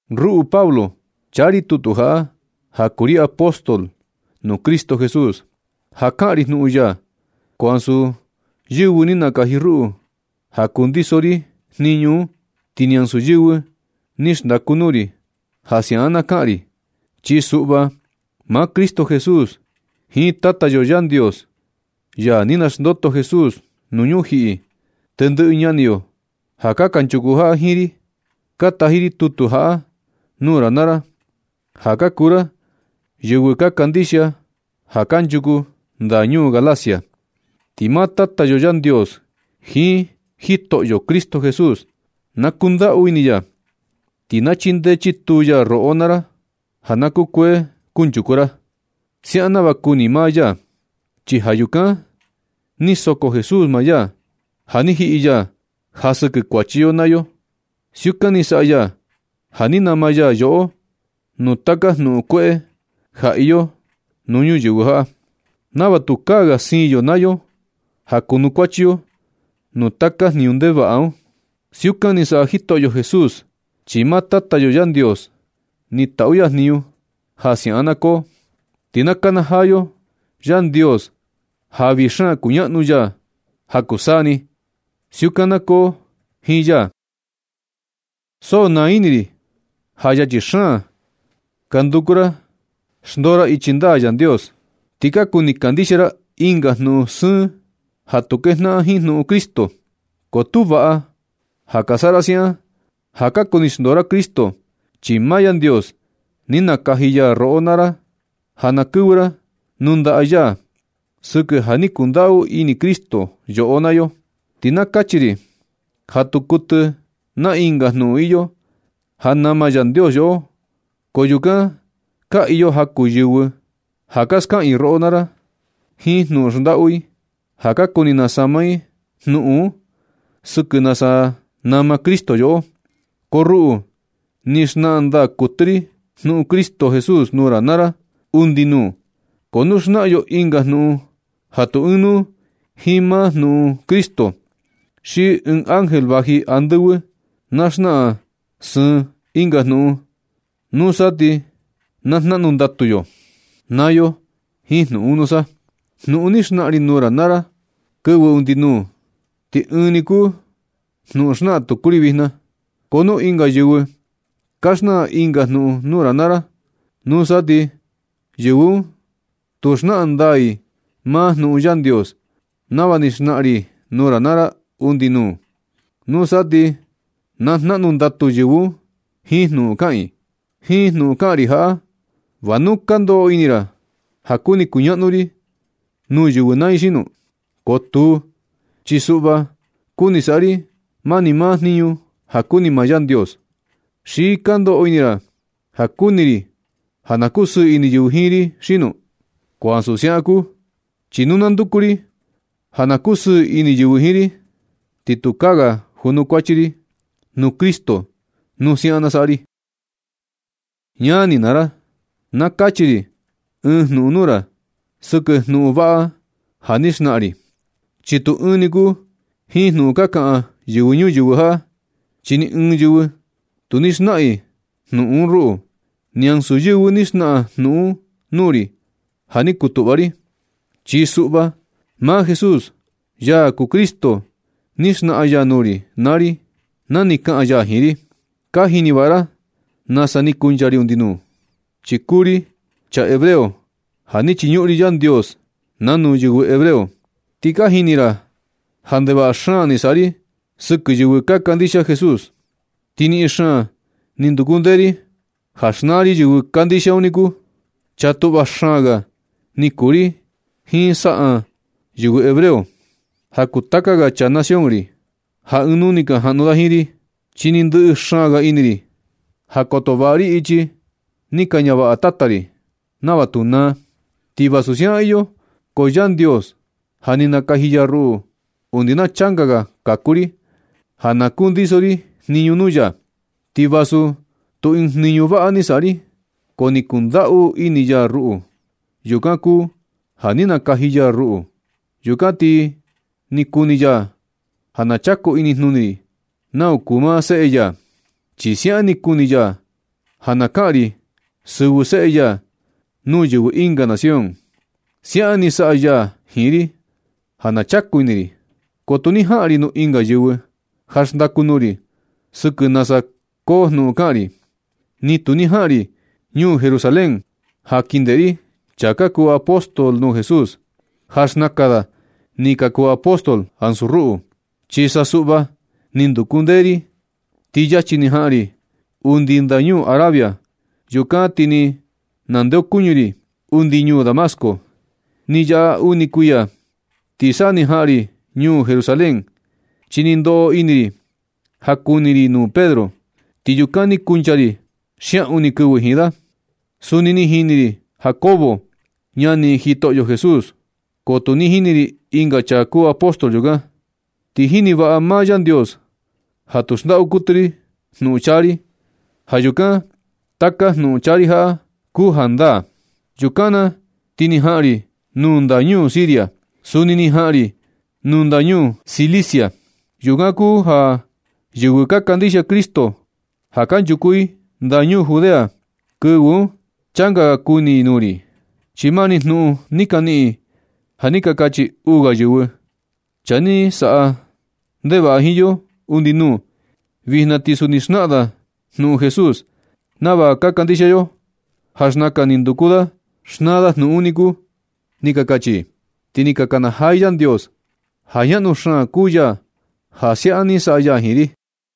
Ruꞌu Pablo, chaa ri tutu jaꞌa, ja kuu ri apóstol nuu Cristo Jesús ja kaꞌan ri jnuꞌun ya. Ko ansu yɨvɨ ni nakaji ruꞌu ja kundiso ri jniñu un. Ti ni ansu yɨvɨ ni xndaku nuu ri ja siaꞌan na kaꞌan ri. Chi suꞌva, maa Cristo Jesús jiin Tata yo Yandios, ya ni xnandoto Jesús nuu ñujiꞌi. Tendɨꞌɨ ñani yo ja kanchuku jaꞌa jiin ri, ka taji ri tutu jaꞌa nuu ra naa ra, ja ka kuu ra yɨvɨ ka kandixia ja kanchuku ndañuu Galacia. Ti maa Tata yo Yandios jiin Jitoꞌyo Cristo Jesús, na kundaꞌu ini ya, ti na chindee chituu ya roꞌo naa ra ja na kukuee kunchuku ra, siaꞌan nava kuni maa ya. Chi ja yukan ni soko Jesús maa ya, ja ni jiꞌi ya ja sɨkɨ kuachi yo naa yo. Siukan ni saꞌa ya ja ni nama ya yoꞌo nuu taka jnuꞌun kueꞌe ja iyo nuu ñuyɨvɨ jaꞌa, nava tukaa ga siin yo naa yo ja kunukuachi yo nuu taka jniñu ndevaꞌa un. Siukan ni saꞌa Jitoꞌyo Jesús, chi maa Tata yo Yandios ni taꞌu ya jniñu ja siaꞌan na koo. Ti na kanajaa yo Yandios ja vii xaan kuñaꞌnu ya ja kuu taka saa ni. Siukan na koo jiin ya. So naa ini ri ja yachi xaan ka nduku ra xndoo ra ichi ndaa Yandios, ti ka kuni kandixia ra ɨnga jnuꞌun sɨɨn ja tu kejnaꞌan jiin jnuꞌun Cristo. Ko tu vaꞌa ja ka saꞌa ra siaꞌan ja ka kuni xndoo ra Cristo. Chi maa Yandios ni nakaji roꞌo naa ra ja na kɨvɨ ra nuu ndaꞌa ya sɨkɨ ja ni kundaꞌu ini Cristo yoꞌo naa yo. Ti na kachi ri ja tu kuɨtɨ naa ɨnga jnuꞌun iyo ja nama Yandios yoꞌo. Ko yukan ka iyo jaku yɨvɨ ja ka skaꞌan i roꞌo naa ra jiin jnuꞌun xndaꞌu i ja ka kuni nasama i jnuꞌun sɨkɨ nasa nama Cristo yoꞌo. Ko ruꞌu, ni xnaꞌan ndaa kuɨtɨ ri jnuꞌun Cristo Jesús nuu ra naa ra undi nuu. Ko nu xnaꞌan yo ɨnga jnuꞌun ja tu ɨɨn nuu jiin maa jnuꞌun Cristo, xi ɨɨn ángel vaji andɨvɨ na xnaꞌan sɨɨn ɨnga jnuꞌun, nusa ti na jnaꞌnu ndatu yo naa yo jiin jnuꞌun un nusa. Jnuꞌun ni xnaꞌan ri nuu ra naa ra kɨvɨ undi nuu, ti ɨɨn ni kuu jnuꞌun xnaꞌan tuku ri vijna. Ko nu iyo ɨnga yɨvɨ ka xnaꞌan ɨnga jnuꞌun nuu ra naa ra, nusa ti yɨvɨ un tu xnaꞌan ndaa i maa jnuꞌun Yandios nava ni xnaꞌan ri nuu ra naa ra undi nuu. Nusa ti na jnaꞌnu ndatu yɨvɨ un jiin jnuꞌun kaꞌan i. Jiin jnuꞌun kaꞌan ri jaꞌa, ¿Va nu ka ndoꞌo ini ra ja kuni kuñaꞌnu ri nuu yɨvɨ naa i xino? Ko tuu, chi suꞌva kuni saꞌa ri mani maa jniñu ja kuni maa Yandios. ¿Xi ka ndoꞌo ini ra ja kuni ri ja na kusɨɨ ini yɨvɨ jiin ri xino? Ko ansu siaꞌan kuu, chi nu na nduku ri ja na kusɨɨ ini yɨvɨ jiin ri, ti tukaa ga junukuachi ri nuu Cristo nu siaꞌan na saꞌa ri. Ñani naa ra, na kachi ri ɨɨn jnuꞌun nuu ra sɨkɨ jnuꞌun vaꞌa ja ni xnaꞌan ri, chi tu ɨɨn ni kuu jiin jnuꞌun ka kaꞌan yɨvɨ ñuyɨvɨ jaꞌa. Chi ni ɨɨn yɨvɨ tu ni xnaꞌan i jnuꞌun un ruꞌu. Ni ansu yɨvɨ ni xnaꞌan jnuꞌun un nuu ri ja ni kutuꞌva ri. Chi suꞌva, maa Jesús, ya kuu Cristo, ni xnaꞌan ya nuu ri na ni kaꞌan ya jiin ri. Ka jini vaꞌa ra nasa ni kuncha ri undi nuu, chi kuu ri chaa hebreo ja ni chiñuꞌun ri Yandios nanu yɨvɨ hebreo. Ti ka jini ra ja ndevaꞌa xaan ni saꞌa ri sɨkɨ yɨvɨ ka kandixia Jesús. Ti niꞌin xaan ni nduku ndee ri ja xnaa ri yɨvɨ kandixia un niku. Chaa tuꞌva xaan ga ni kuu ri jiin saꞌan yɨvɨ hebreo ja kuu taka ga chaa nación ri, ja ɨɨn nuu ni ka jaꞌnu da jiin ri, chi ni ndɨꞌɨ xaan ga ini ri ja koto vaꞌa ri ichi ni ka ñavaꞌa tata ri, nava tu naa. Ti vasu siukan iyo, ko Yandios ja ni nakaji ya ruꞌu undi na changa ga kaku ri ja na kundiso ri jniñu nuu ya. Ti vasu tu ni ɨɨn jniñu vaꞌa ni saꞌa ri, ko ni kundaꞌu ini ya ruꞌu. Yukan kuu ja ni nakaji ya ruꞌu. Yukan ti ni kuni ya ja na chaku inijnuni ri nau kuu maa Seꞌe ya. Chi siaꞌan ni kuni ya ja na kaꞌan ri sɨvɨ Seꞌe ya nuu yɨvɨ ɨnga nación. Siaꞌan ni saꞌa ya jiin ri ja na chaku ini ri, ko tu ni jaꞌan ri nuu ɨnga yɨvɨ ja xndaku nuu ri sɨkɨ nasa koo jnuꞌun kaꞌan ri. Ni tu ni jaꞌan ri ñuu Jerusalén ja kin ndeꞌe ri chaa ka kuu apóstol nuu Jesús, ja xnakan da ni ka kuu apóstol ansu ruꞌu. Chi sa suꞌva, ni nduku ndee ri ti yachi ni jaꞌan ri undi ndañuu Arabia. Yukan ti ni nandeokuñɨ ri undi ñuu Damasco. Ni yaꞌa uni kuiya ti sa ni jaꞌan ri ñuu Jerusalén, chi ni ndoꞌo ini ri ja kuni ri nuu Pedro. Ti yukan ni kuncha ri xiaꞌun ni kɨvɨ jiin da. Suni ni jini ri Jacobo, ñani Jitoꞌyo Jesús. Ko tu ni jini ri ɨnga chaa kuu apóstol yukan. Ti jini vaꞌa maa Yandios ja tu xndaꞌu kuɨtɨ ri jnuꞌun chaa ri. Ja yukan taka jnuꞌun chaa ri jaꞌa kuu jandaa. Yukan na ti ni jaꞌan ri nuu ndañuu Siria. Suni ni jaꞌan ri nuu ndañuu Cilicia. Yukan kuu ja yɨvɨ ka kandixia Cristo ja kanchuku i ndañuu Judea, kɨvɨ un changa ga kuni i nuu ri. Chi mani jnuꞌun ni ka niꞌin i ja ni ka kachi uu ga yɨvɨ: “Chaa ni saꞌa ndevaꞌa jiin yo undi nuu, vijna ti suni xnaꞌan da jnuꞌun Jesús nava ka kandixia yo, ja xnakan ni nduku da xnaa da jnuꞌun un niku”, ni ka kachi i. Ti ni ka kanajaa i Yandios ja ñaꞌnu xaan kuu ya ja siaꞌan ni saꞌa ya jiin ri.